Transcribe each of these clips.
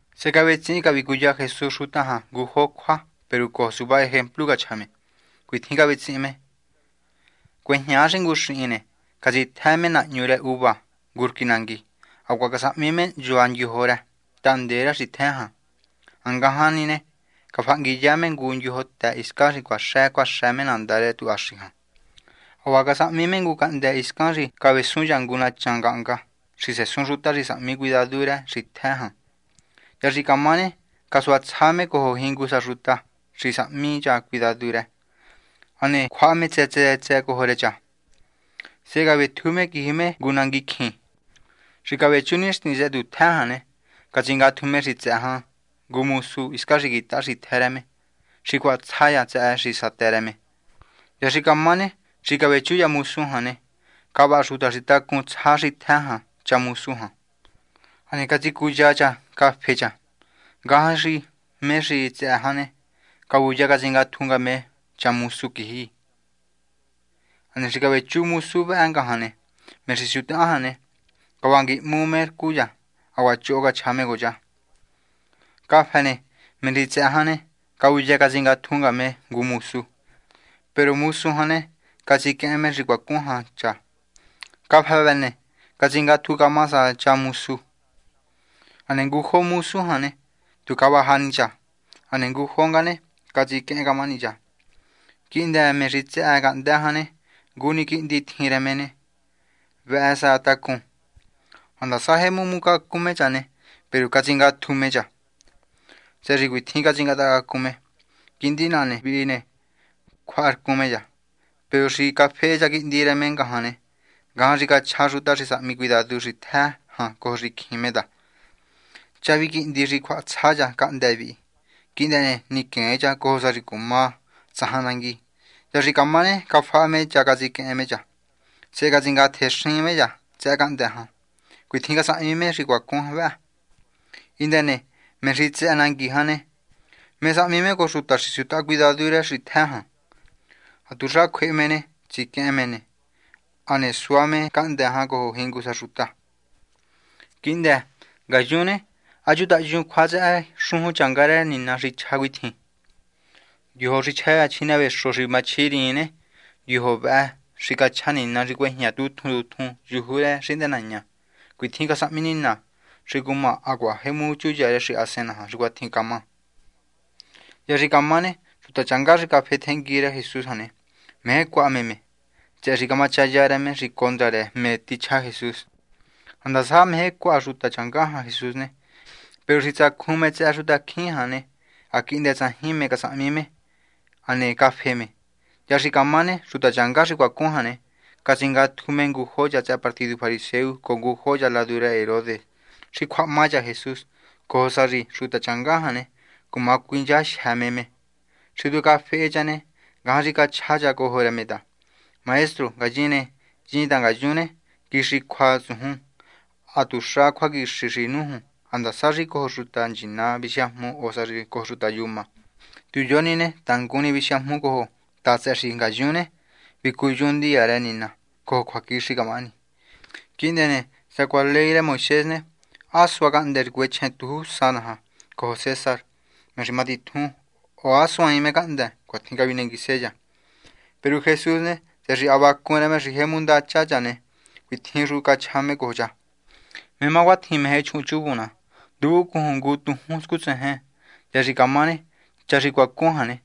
Sehe cavetsihin cavicuya Jesús xuta jan ngujo cjua, peru cojo suva ejemplu cachja me. Cuitjin cavetsihin me cjua: ―Cuejñaa xi ngu xihin ne, catsitjë me nahñu rë uva ngu rquí nangui. Hacuaha casahmi me hnchua xondyojo rë tahndee rë xitjë jan. Ha ngajan ne ne, cafahanguiya me ngu ndyojotë hiscan cuaxë nandá rë tuhaxi jan. Hacuaha casahmi me ngu cahndë́ hiscan xi cavesun me ngu nachan ngahnga xi sesun xuta xi sahmi cuidadu xitjë rë me. ’Hya xi camá ne, casuatsja me cojo jingu sa xuta xi sahmi cha cuidadu rë, hane cjuaha me tsë tsë cojo rë cha. Sehe cavetju me quiji me ngu nanguicjin. Xi cavechú nixtin tsëhë tutjë jan ne, catsingatju me xi tsëhë jan ngu mosu hiscan xi quitaha xitjë rë me, xi cjuahatsja cha tsëhë xi satë rë me. Hya xi camá ne, xi cavechu cha mosu jan ne, cavaja xuta xi tacun tsja xitjë jan cha mosu jan. Hane catsicuya cha cha cafe cha. Ngajan xi me xi tsëhë jan ne, cavuya catsingatju nga me ngu mosu quiji. Hane xi cavechu mosu vëhë ngajan ne, me xi siutaha jan ne, cavanguihmu me rcu cha, hacuaha choho cachja me cojo cha. Cafë ne, me xi tsëhë jan ne, cavuya catsingatju nga me ngu mosu. Peru mosu jan ne, catsiquehen me xi cuacun jan cha. Cafë vëhë ne, catsingatju camaha sa cha mosu. Hane ngujo mosu jan ne, tu cavaja ni cha. Hane ngujo nga ne, catsiquehen camahani cha. ’Quihndë me xi tsëhë cahndë́ jan ne, ngu ni quihndi tjin rë me ne, vëhë sa tacun. Handasa jemu hmucacun me cha ne, peru catsingatju me cha, tsëhë xi cuitjin catsingatahacacun me: “Quihndi naha vi ne, cjuaharcun me cha.” Peru xi cafehe cha quihndi rë me ngajan ne, ngajan xi chja xuta xi sahmi cuidadu xitjë jan cojo xicjin me ta: “Cha vihi quihndi xi cjuahatsja cha cahndë́ vihi. Quihndë ne, niquen cha, cojo sa xi cumá tsajan nangui.” Hya xi camá ne, cafaha me cha catsiquehen me cha, sehe catsingatjexin me cha tsëhë cahndë́ jan. Cuatjin casahmi me xi cuacun vë. ’Hindë ne, me xi tsëhë nangui jan ne, ¿mé sahmi me cojo xuta xi siutaha cuidadu rë xitjë jan? Hatuxa cjue me ne, tsiquehen me me, hane sua me cahndë́ jan cojo jingu sa xuta. ’Quihndë, ngayun ne, ha chutayuun cjua tsëhë xujun rë Nina xi chja cuitjin: Ndyojo xi chja cha chjinevexo xi machjiriin ne, ndyojo vëhë xi cachja Nina xi cuejña tjun tjun yuju rë xihndënaña. Cuatjin casahmi Nina xi cumá hacuaha jemu chuya rë xahasen naja xi cuatjin camá. Hya xi camá ne, xuta changá xi cafehe tjengui rë Jesús jan ne, meje cjuaha me me, tsëhë xi camachaya rë me xi condra rë me xi cachja Jesús. Ha ndasa meje cjuaha xuta changá jan Jesús ne, peru xi tsacjun me tsëhë xutacjín jan ne, ha quihndë tsajin mé casahmi me, hane cafe me. Hya xi camá ne, xuta changá xi cuacun jan ne, catsingatju me ngujo cha tsëhë partidu fariseo cojo ngujo cha ladu rë Herodes xi cjuahangahma cha Jesús, cojo sa xi xuta changá jan ne, cuma cuinchajyë me me. Xi tu cafehe cha ne, ngajan xi cachja cha cojo rë me ta: ―Maestro. Ngayin ne, hyin ta ngayun ne, quixi cjua tsujun. Ha tuxa cjuaquixi xi nújun ha ndasa xi cojo xuta nchina visiajmu o sá cojo xuta yuma. Tu yo ni ne tangun ni visiajmu cojo ta tsëhë xi ngayun ne, vicuyun ndiya rë Nina cojo cjuaquixi camahani. Quihndë ne, sacuaha ley rë Moisés ne, ¿há sua cahndë́ xi cuechjen tujúnsa naja cojo César, me xi matitjun, o há suaain cahndë́? ―Cuatjin cavinenguise cha. Peru Jesús ne, tsëhë xi ha vacun rë me xi jemu ndacha cha ne, cuitjin xu cachja me cojo cha: ―¿Mé má cuatjin meje chuhunchuvun ná? Nduvuncujun ngu tujún scutséjen. Hya xi camá ne, cha xi cuacun jan ne,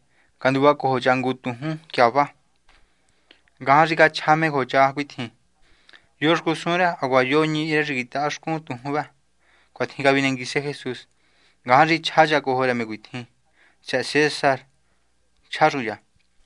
canduvacojo cha ngu tujún tyava. Ngajan xi cachja me cojo cha cuitjin: ―¿Yo xcusun rë hacuaha yo ñihi rë xi quitahá xcun tujún vë? ―Cuatjin cavinenguise Jesús. Ngajan xi chja cha cojo rë me cuitjin: ―Tsëhë César. ―Chja xu cha.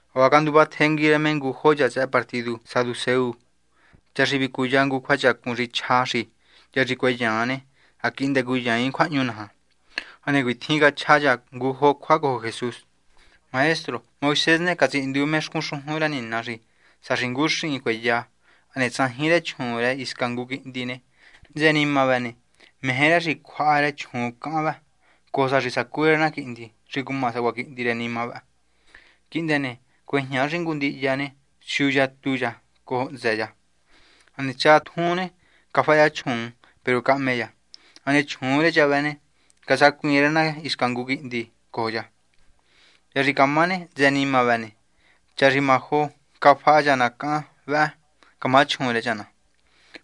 Hacuaha canduva tjengui rë me ngujo cha tsëhë partidu saduceo, cha xi vicuya ngu cjuachacun xi chja xi hya xi cueyan ne, ha quihndë cuyaain cjuahñu naja. Hane cuitjin cachja cha ngujo cjua cojo Jesús: ―Maestro. Moisés ne, catsihindu me xcun xujun rë Nina xi sá xi ngu xihin cueya, hane tsajin rë chjuun rë hisca ngu quihndi ne, hntsë nima vëhë ne, meje rë xi cjuaha rë chjuun cahan vëhë, cojo sa xi sacú rë na quihndi xi cuma sacuaha quihndi rë nima vëhë. Quihndë ne, cuejña xi ngu ndihya ne, siu yatu cha cojo hntsë cha. Hane cha tjun ne, cafaha cha chjuun. Peru cahme cha, hane chjuun rë cha vëhë ne, casacuiin rë na hisca ngu quihndi cojo cha. Hya xi camá ne, hntsë nima vëhë, cha xi majo ne, cafaha cha na cahan vëhë camá chjuun rë cha na,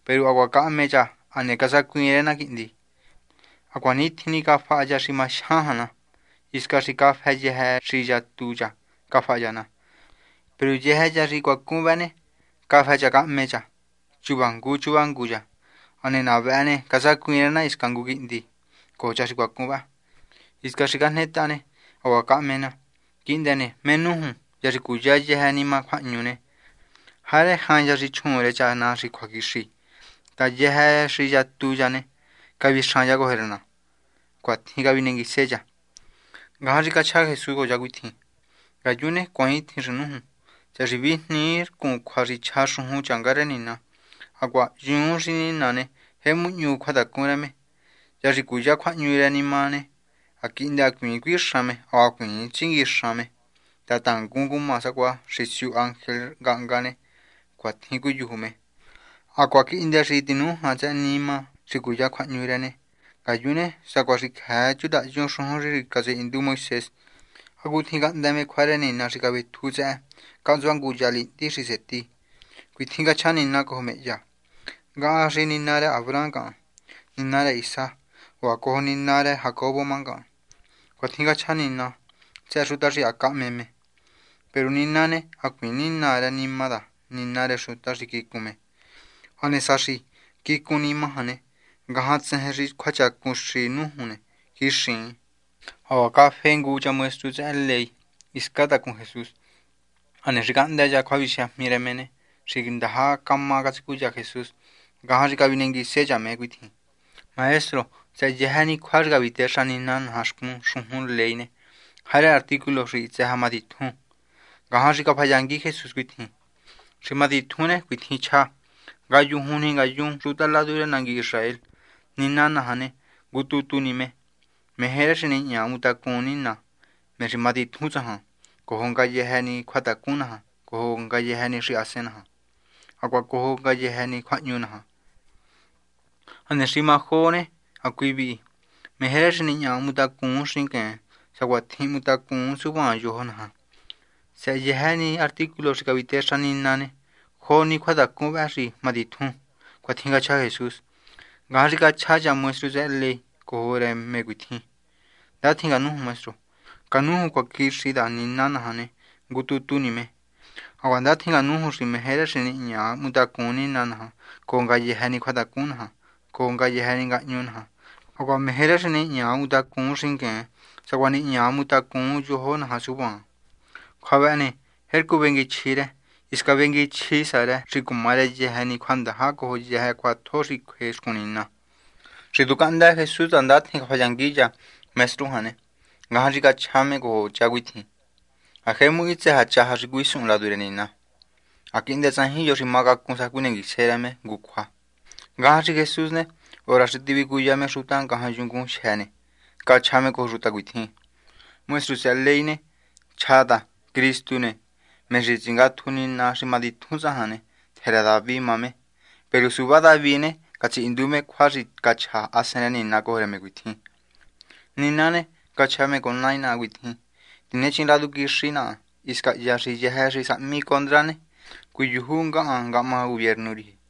peru hacuaha cahme cha hane casacuiin rë na quihndi. Hacuanitjin ni cafaha cha xi majyan jan na, hisca xi cafë yëjë xi yatu cha cafaha cha na. Peru yëjë cha xi cuacun vëhë ne, cafë cha cahme cha chuva ngu chuva ngu cha. Hane na vëhë ne, casacuiin rë na hisca ngu quihndi cojo cha xi cuacun vëhë. Hiscan xi cajnetaha ne, hacuaha cahme na. Quihndë ne, ¿mé nújun? Hya xi cuya yëjë nima cjuahñu ne, ¿jarë jain cha xi chjuun rë cha na xi cjuaquixi? ta yëjë xi yatu cha ne, cavixan cha cojo rë na. ―Cuatjin cavinenguise cha. Ngajan xi cachja Jesús cojo cha cuitjin: ―Ngayun ne, cuaaintjin xi nújun, tsëhë xi vijnii rcun cjua xi chja xujun rë Nina, hacuaha hyuun xi Nina ne, jemu hñu cjuatacun rë me. Hya xi cuya cjuahñu rë nima ne, ha quihndë hacuiin cuixan me hacuaha hacuiin tsinguixan me, ta tangun cumá sacuaha xi siu ángel ngahnga ne, cuatjin cuiyuju me. Hacuaha quihndë xi tinújan tsëhë nima xi cuya cjuahñu rë ne, ngayun ne, sacuaha xi cjëë chutayun xujun xi catsihindu Moisés hacutjin cahndë́ me cjua rë Nina xi cavetju tsëhë cahntsua ngu ya lihndi xi seti. Cuitjin cachja Nina cojo me hya: “Ngahan xi Nina rë Abraham ngahan. Nina rë Isaac, hacuaha cojo Nina rë Jacobo má ngahan.” Cuatjin cachja Nina tsëhë xuta xi ha cahme me. Peru Nina ne, hacuiin nina rë nima ta nina rë xuta xi quicun me. Hane sá xi quicun nima jan, ngajan tsejen xi cjuachacun xi nújun ne, quixiin. Hacuaha cafehe ngu cha maestru tsëhë ley hiscan tacun Jesús. Hane xi cahndë́ cha cjuavisiajmi rë me ne, xi ndaja cama catsicuya Jesús, ngajan xi cavinenguise cha me cuitjin: ―Maestro, tsëhë yëjë ni cjua xi cavitexa Nina naja xcun xujun ley ne, ¿jarë artículo xi hitsë sa matitjun? Ngajan xi cafayangui Jesús cuitjin: ―Xi matitjun ne, cuitjin chja: “Ngayujun ni ngayun xuta ladu rë nangui Israel, Nina naja ne, ngu tu tu ni me. Meje rë xi nihña hmutacun Nina, me xi matitjun tsajan, cojo ngayëjë ni cjuatacun naja, cojo ngayëjë ni xahasen naja, hacuaha cojo ngayëjë ni ngahñu naja.” Hane xi má jo ne hacui vihi: “Meje rë xi nihña hmutacun xingueen sacuatjin hmutacun suvaan yojo naja.” Tsëhë yëjë ni artículo xi cavitexa Nina ne, jo ni cjuatacun vëhë xi matitjun. ―Cuatjin cachja Jesús. Ngajan xi cachja cha maestru tsëhë ley cojo rë me cuitjin: ―Ndatjin canújun, maestro. Canújun cjuaquixi ta Nina naja ne, ngu tu tu ni me. Hacuaha ndatjin canújun xi meje rë xi nihña hmutacun Nina cojo ngayëjë ni cjuatacun naja, cojo ngayëjë ni ngahñu naja, hacuaha meje rë xi nihña hmutacun xingueen sacuaha nihña hmutacun yojo naja suvaan. Cjua vëhë ne, tjercu venguichji rë. Hisca vengui sa chji rë xi cuma rë yëjë ni cjuandaja cojo yëjë cjuatjo xi cjue xcun Nina. Xi tu cahndë Jesús ta ndatjin cafayangui cha maestru jan ne, ngajan xi cachja me cojo cha cuitjin: ―Ha jemu hitsë sa chaja xi cuisuhun ladu rë Nina. Ha quihndë tsajin yo xi macacun sa cjuinenguise rë me ngu cjua. Ngajan xi Jesús ne, hora xi tivicuya me xuta ngajan yungun xi matitjun ne, cachja me cojo xuta cuitjin: ―Maestru tsëhë ley ne, chja cha ta Cristu, me xi tsingatju Nina xi cumatitjun tsajan ne, tjë rë David má me. Peru suva David ne, catsihindu me cjua xi cachja Hasen rë Nina cojo rë me cuitjin: Nina ne, cachja me cojo Nai naha cuitjin: “Tinechin ladu quixi naha hiscan hya xi yëjë xi sahmi condra ne, cuiyuju ngahan ngahma gubiernu riji.”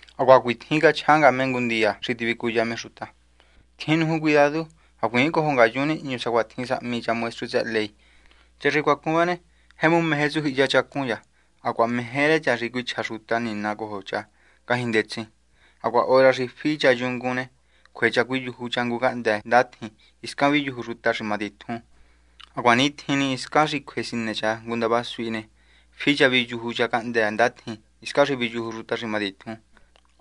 Hacuaha cuatjin cachja nga me ngu ndiya xi tivicuya me xuta: ―Tjin nuju cuidadu. Hacuiin cojo ngayun nihñu sacuatjin sahmi cha maestru tsëhë ley. Cha xi cuacun vëhë ne, jemu meje tsujyihiya chacun cha hacuaha meje rë cha xi cuichja xuta nina cojo cha ngajñi ndetsin. Hacuaha hora xi fi cha yungun ne, cjue cha cuiyuju cha ngu cahndë́ ndatjin hiscan viyuju xuta xi matitjun. Ha cuanitjin ni hiscan xi cjue sinë cha ngu ndava suhi ne, fi cha viyuju cha cahndë́ ndatjin hiscan viyuju xuta xi matitjun.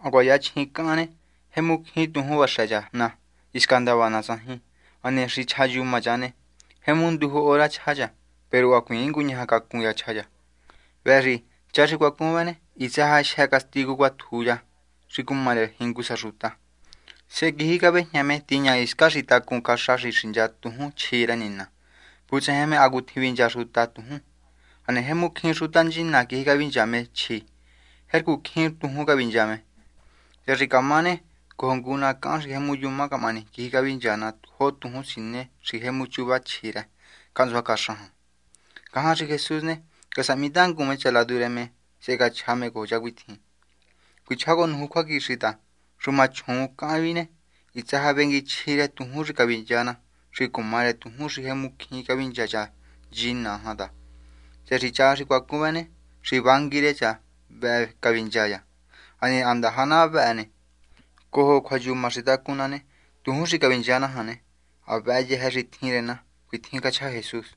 Hacuaha yachjin cahan ne, jemu cjín tujún vaxë cha na. Hisca ndava na tsajin. Hane hisca xi chjayuma cha ne, jemu nduju hora chja cha, peru hacuiin nguñaja cacun cha chja cha. Vëhë xi cha xi cuacun vë ne, hitsë sa jyë castigu cuatjun cha, xi cuma rë jingu sa xuta. Sehe quiji cavéjña me tiña hiscan xi tacun caxa xi xincha tujún chjë rë Nina, vutsejen me hacutjin vincha xuta tujún. Hane jemu cjín xuta nchina quiji cavincha me chjë rë, jercu cjín tujún cavincha me. Hya xi camá ne, cojo ngu na cahan xi jemu yuma camahani quiji cavincha na jo tujún siné xi jemu chuva chji rë cahntsua caxa jan. Ngajan xi Jesús ne, casahmitangun me cha ladu rë me, sehe cachja me cojo cha cuitjin: ―Cuichjá cojo nuju cjuaquixi ta xuma chjuun cahan vihi ne, hitsë sa vengui chji rë tujún xi cavincha na, xi cumá rë tujún xi jemu cjín cavincha cha nchina jan ta, tsëhë xi cha xi cuacun vëhë ne, xi vangui rë cha ne, vëhë xi cavincha cha. Hane ha ndaja na vëhë ne, cojo cjuayuma xi tacun na ne, tujún xi cavincha na jan ne, ha vëhë yëjë ni xi tjin rë na. ―Cuatjin cachja Jesús.